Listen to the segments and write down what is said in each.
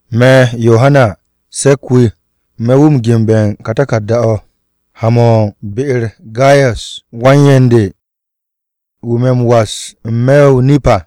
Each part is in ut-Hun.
Me̱, Yohana, se̱k-wu̱ me̱ wu̱ ge̱nbe̱ ka taku̱rda-o̱, ha-mo̱ u̱n be-u̱r Gayas wan-yen de wu̱ me̱ m-was n-me̱ o-nip à.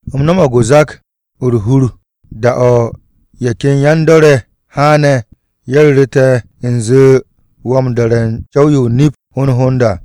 U̱m no̱mo̱g zak-o̱ u̱r-hur da-o̱ ye̱ ken yan-dor ye̱ haane̱, ye̱ ru̱ru̱ te̱ u̱nze wo̱ m-do̱re̱ u̱n co̱w-yo o-nip hond hond à.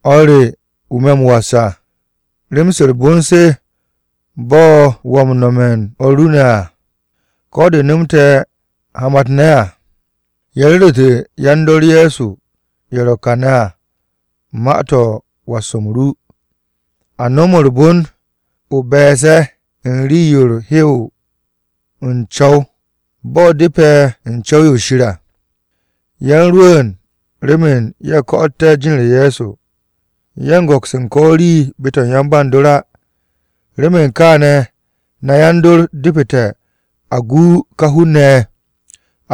O̱r re, wu̱ me̱ m-was à, rem-se u̱r-bon se bo̱ wo̱ m-nome̱ u̱n o̱r ru ne̱ à, ko̱ de nomte̱ hamat-ne̱ à. Ye̱ ru̱ru̱te̱ yan-dor Ye̱so ye̱ ro̱ kane̱ à ma-to̱ u̱n was-m ru. A no̱m u̱r-bon o be̱e̱s ye̱ u̱n rii-yo u̱r-hew u̱n co̱w, bo̱ depe̱ u̱n co̱w-yo Shir à. Ye̱ u̱n rwu̱u̱n remen ye̱ ko̱'o̱tte̱ jin-u̱r Ye̱so. Ye̱ u̱n go̱ks u̱n ko̱ rii be-to̱ u̱n ye̱ nape̱ Shir á. Remen kaane̱ na yan-dor depu̱te̱ a gu ka hun-ne̱ ye̱,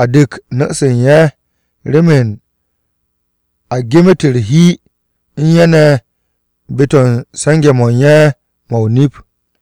a dek nu̱-se u̱n ye̱ remen a gem-u̱t u̱r-hi u̱n ye̱ ne̱ be-to̱ u̱n se̱nge̱-mo̱ u̱n ye̱ mo̱ o-nip.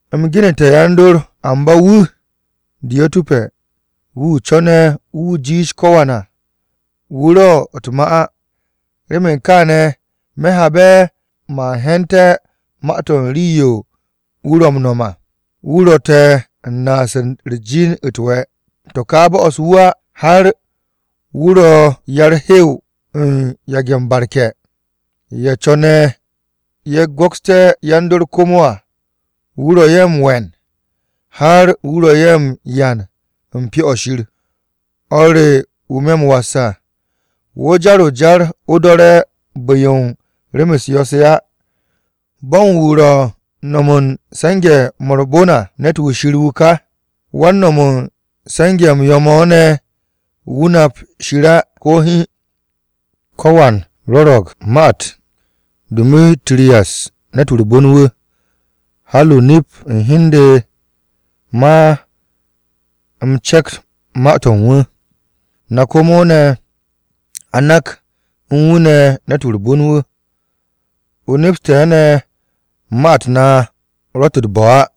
U̱m genu̱te̱ yan-dor, amba wu̱ Diyo̱tu̱pe̱, wu̱ co̱ne̱ wu̱ jiish ko̱wan à, wu̱ ro̱ u̱n ma-u̱t te̱ á. Remen kaane̱, me̱ habe̱ man he̱nte̱ ma-to̱ u̱n rii-yo wu̱ ro̱ m-no̱m à, wu̱ ro̱ te̱ u̱n naas u̱r-jin u̱t-we̱. To̱ ká bo'os wu̱ á, har wu̱ ro̱ ya-u̱r-hew u̱n yage̱ m-barke̱. Ye̱ co̱ne̱ ye̱ go̱kste̱ yan-dor komo à, wu̱ ro̱ ye̱ m-we̱n, har wu̱ ro̱ ye̱ m-yan u̱n Pyo-o̱ Shir. O̱r re wu̱ me̱ m-was à, wo̱ jar o-jar o do̱re̱ bu̱-yo u̱n rem-u̱s yo̱-se á. Bo̱n wu̱ ro̱ u̱n no̱m u̱n se̱nge̱-mo̱ u̱r-bon à, ne̱t-wu̱ Shir wu̱ ká. Wan-no̱m u̱n se̱nge̱-m yo̱-mo̱ ne̱, wu̱ nap Shir á, ko̱ hiin. Ko̱wan rwo̱ro̱g ma-u̱t Du̱mitu̱riyas ne̱t-wu̱ u̱r-bon wu̱, har o-nip u̱n hi u̱n de man cep ma-to̱ u̱n wu̱. Na komo ne̱, a nak u̱n wu̱ ne̱ ne̱t-wu̱ u̱r-bon wu̱. O nepste̱ ne̱ ma-u̱t na ro̱tt u̱t-bo̱ á.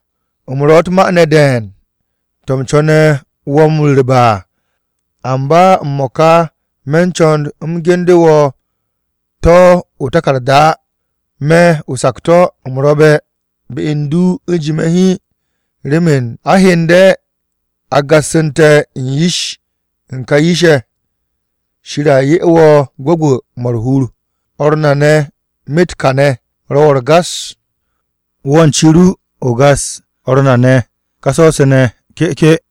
U̱m ro̱ u̱t-ma ne̱ de̱e̱n to̱ u̱m co̱ne̱ wo̱ m-ru̱rbe̱ à, amba m-mo̱ka me̱ co̱n u̱m ge̱nbe̱ wo̱ to̱ o-taku̱rda á. Me̱ o-sakto̱, u̱m ro̱be̱ be u̱n du u̱jime̱ hiin, remen a hyende̱ a gassu̱nte̱ yish-ye̱ ka yish-ye̱. Shir a 'ye wo̱ gwu̱gwu̱-mo̱ u̱r-hur. O̱r na ne̱ myet kàne̱ ro̱ wo̱ u̱r-gas. Wo̱ u̱n ci ru, o gas o̱r na ne̱ ká so̱-se ne̱, ke̱'ke̱.